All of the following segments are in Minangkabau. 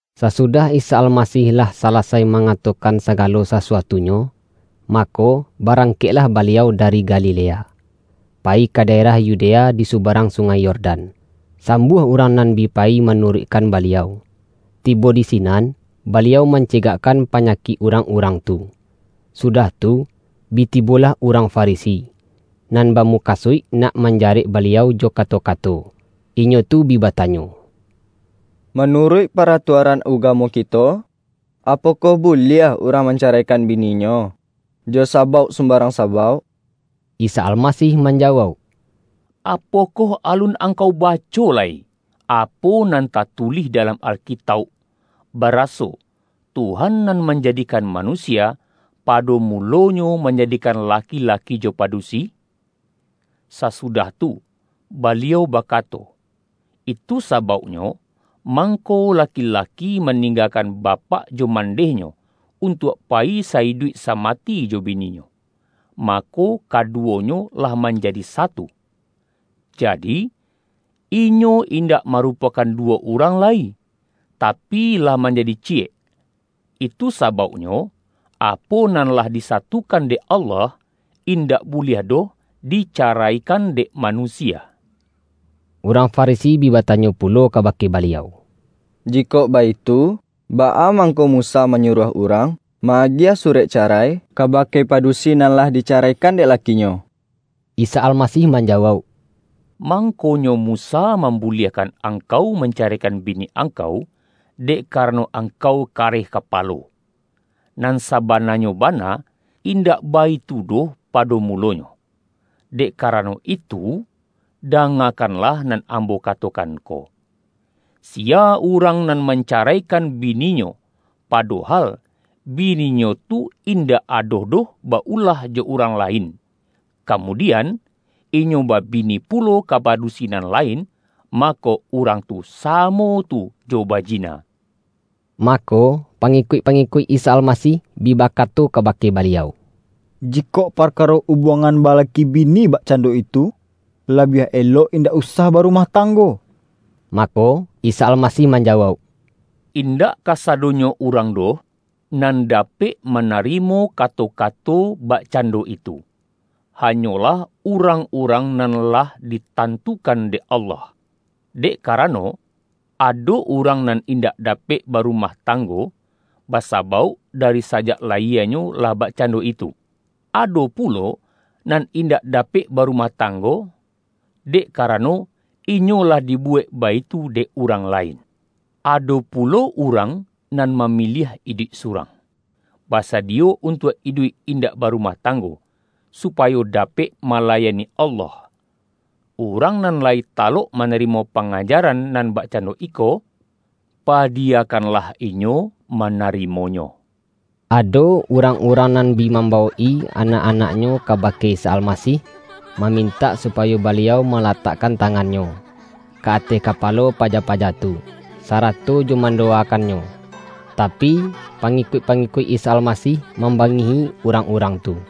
Sasudah Isa Almasih lah sala-sai mangatokan sagalo sasu-atunyo, mako, barangkeklah Baliau dari Galilea, payi ka daerah Yudea di subarang Sungai Yordan. Sambuah urang nan bi payi manuruikkan Baliau, tibo di sinan, Baliau mancegakkan pa-nyakik urang-urang tu. Sudah tu, bi tibolah urang Farisi, nan bamukasuik nak manjarek Baliau jo kato-kato. Inyo tu bi batanyo,”Ma-nuruik paratuaran ugamo kito, apokoh buliah urang mancaraikan bininyo jo sabauk sumbarang sabauk?” Isa Almasih manjawauk,”Apokoh alun angkau baco lai, apo nan tatu-lih dalam Alkitauk, baraso, Tuhan nan manjadikan manusia, pado mulonyo manjadikan laki-laki jo padusi? Sasu-dah tu, Baliau bakato, ’Itu sabauknyo mangko laki-laki maninggakan bapak jo mandehnyo, untuak payi sa-iduik samati jo bininyo, mako, kaduwonyo lah manjadi satu.’ Jadi, inyo indak marupokan duwo urang lai, tapi, lah manjadi ciyek. Itu sabauknyo apo nan lah disatukan dek Allah, indak buliah doh dicaraikan dek manusia.” Urang Farisi bi batanyo pulo kaba-ke Baliau,”Jikok baitu, baa mangko Musa manyuruah urang ma-agiah su-rek carai, kabake padusi nan lah di-caraikan dek lakinyo?” Isa Almasih manjawauk,”Mang-konyo Musa mambuliahkan angkau mancaraikan bini angkau, dek kara-no angkau kareh kapalo. Nan sabana-nyo bana, indak baitu doh pado mu-lonyo. Dek karano itu, dangakanlah nan Ambo katokan ko: Siya urang nan mancaraikan bininyo padohal, bini-nyo tu indak ado doh ba-ulah jo urang lain kamudian, inyo babini pulo ka padusi nan lain, mako, urang tu sa-mo tu jo bajina.” Mako, pangikuik-pangikuik Isa Almasih bi bakato kabake Baliau,”Ji-kok parkaro ubuangan balaki bini bak-cando itu, labiah elok indak usah ba-rumah tanggo.” Mako, Isa Almasih manjawauk,”Indak kasadonyo urang doh, nan da-pek manarimo kato-kato bakcando itu, hanyolah urang-urang nan lah ditan-tukan dek Allah. Dek karano, ado urang nan indak dapek barumah tang-go, basabauk dari sajak layienyo lah bakcando itu. Ado pulo nan indak da-pek barumah tanggo, dek karano inyo lah dibuwek baitu dek urang lain. Ado pulo urang nan mamiliah iduik surang, basadiyo untuak iduik indak barumah tanggo, supayo dapek malayani Allah. Urang nan lai talok manarimo panga-jaran nan bakcando iko, padiyakan-lah inyo manarimonyo.” Ado urang-urang nan bi mam-bawok-i anak-anaknyo kabake Isa Almasih, mamintak supayo Baliau ma-latakkan tangan-Nyo, ka ateh kapalo paja-paja tu, sarato jo mandowakan-nyo. Tapi, pangikuik-pangikuik Isa Almasih mambangihi urang-urang tu.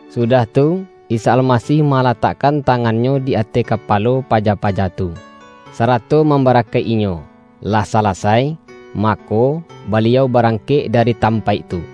Sudah tu, Isa Almasih malatak-kan tangan-Nyo di ateh kapalo paja-paja tu, sarato mambarakaik-inyo. Lah salasai, mako, Baliau barangkek da-ri tampaik tu.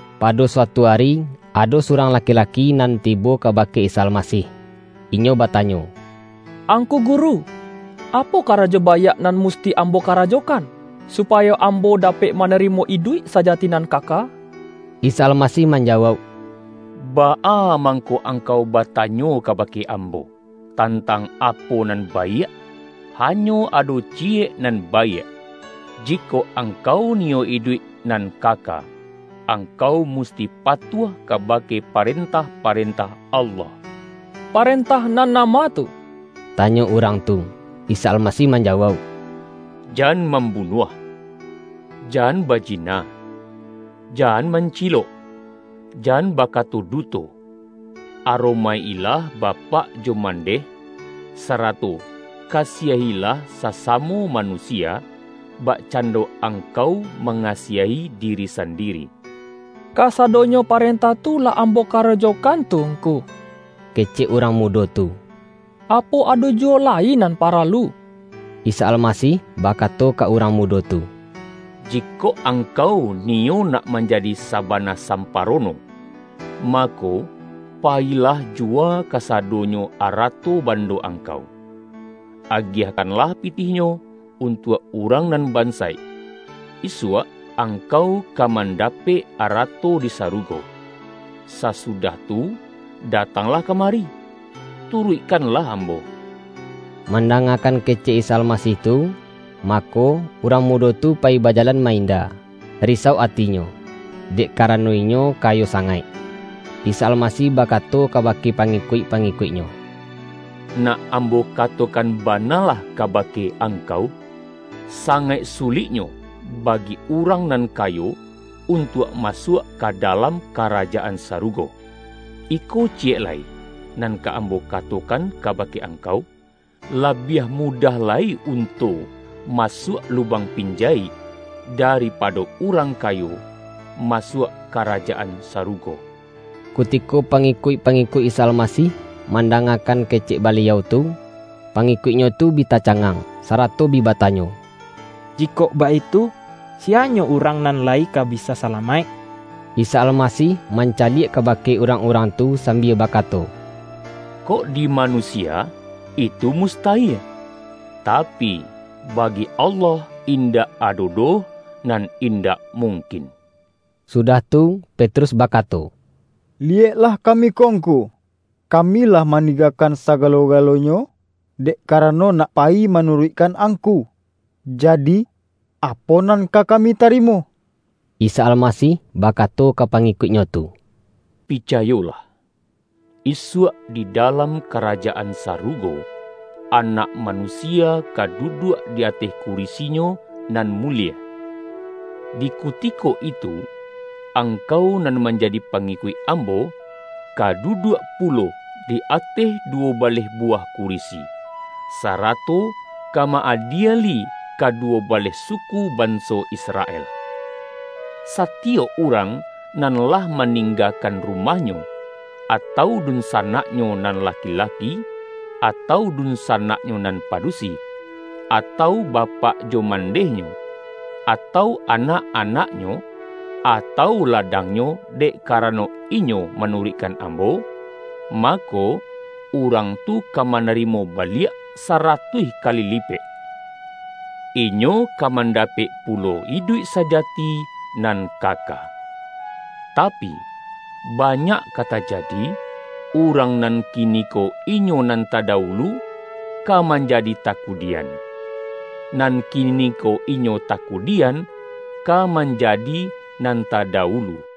Pado suatu ari, ado surang laki-laki nan tibo kabake Isa Almasih. Inyo bata-nyo,”Angku Guru! Apo karajo baiak nan musti ambo karajokan, supayo ambo da-pek manarimo iduik sajati nan kaka?” Isa Almasih manjawauk,”Baa mangko angkau batanyo kabake Ambo, tantang apo nan baiak? Hanyo ado Ci-yek nan baiak. Jikok angkau niyo iduik nan kaka, angkau musti patuah kaba-ke parentah-parentah Allah.” ”Parentah nan nama tu?” tanyo urang tu. Isa Almasih manjawauk,”Jan mam-bunuah, jan bajina, jan mancilok, jan bakato duto, aromaik-ilah bapak jo mandeh; sarato kasiahilah sasamo ma-nusia, bakcando angkau mangasiahi diri sandiri.” ”Kasadonyo parentah tu lah ambo karajokan tu Ngku,” kecek urang mudo tu.”Apo ado juwo lai nan paralu?” Isa Almasih bakato ka urang mudo tu,”Jikok angkau niyo nak manjadi sa-bana samparono, mako, payilah juwa kasadonyo arato bando angkau. Agiah-kanlah pitihnyo untuak urang nan ban-saik, isuak angkau ka mandapek arato di sarugo. Sasudah tu, datanglah ka-mari, turuikkanlah Ambo!” Mandangakan kecek Isa Almasih tu, mako, urang mudo tu payi baja-lan ma-inda, risau atinyo, dek kara-no inyo kayo sangaik. Isa Almasih bakato kabake pa-ngikuik-pangikuik-Nyo,”Nak Ambo katokan banalah kabake angkau, sa-ngaik suliknyo bagi urang nan kayo untuak masuak ka dalam Karajaan Sarugo. Iko ciyek lai nan ka Ambo katokan kabake angkau; labiah mu-dah lai unto masuak lubang pinjayik, daripado urang kayo masuak Karaja-an Sarugo.” Kutiko pangikuik-pangikuik Isa Almasih mandangakan kecek Baliau tu, pangikuik-Nyo tu bi tacangang, sa-rato bi batanyo.”Jikok baitu, siyanyo urang nan lai ka bisa salamaik?” Isa Almasih mancaliak kabake nrang-urang tu sambia bakato,”Kok di manusia itu mustayie! Tapi, bagi Allah, indak ado doh nan indak mungkin.” Sudah tu Petrus bakato,”Liyek-lah kami ko Ngku, kami lah maninggakan sagalo-galonyo, dek karano nak payi manuruikkan Angku. Jadi, apo nan ka kami tarimo?” Isa Almasih bakato ka pangikuik-Nyo tu,”Picayolah: Isuak di dalam Ka-rajaan Sarugo, Anak Manusia ka du-duak di ateh kurisi-Nyo nan mulie. Di kutiko itu, angkau nan manjadi pangi-kuik Ambo, ka duduak pulo di ateh duwo baleh buwah kurisi, sarato ka ma-adieli kaduwo baleh suku banso Israel! Satiyok urang nan lah ma-ninggakan rumahnyo, atau dunsanak-nyo nan laki-laki, atau dunsanaknyo nan padusi, atau bapak jo mandehnyo, atau anak-anaknyo, atau ladangnyo, dek karano inyo manuruikkan Ambo, mako, urang tu ka manarimo baliak saratuih kali lipek. Inyo ka mandapek pulo iduik sajati nan kaka. Tapi, ba-nyak ka tajadi, urang nan kiniko inyo nan tadawulu, ka manjadi takudian, nan kiniko inyo takudian, ka manja-di nan ta dawulu.”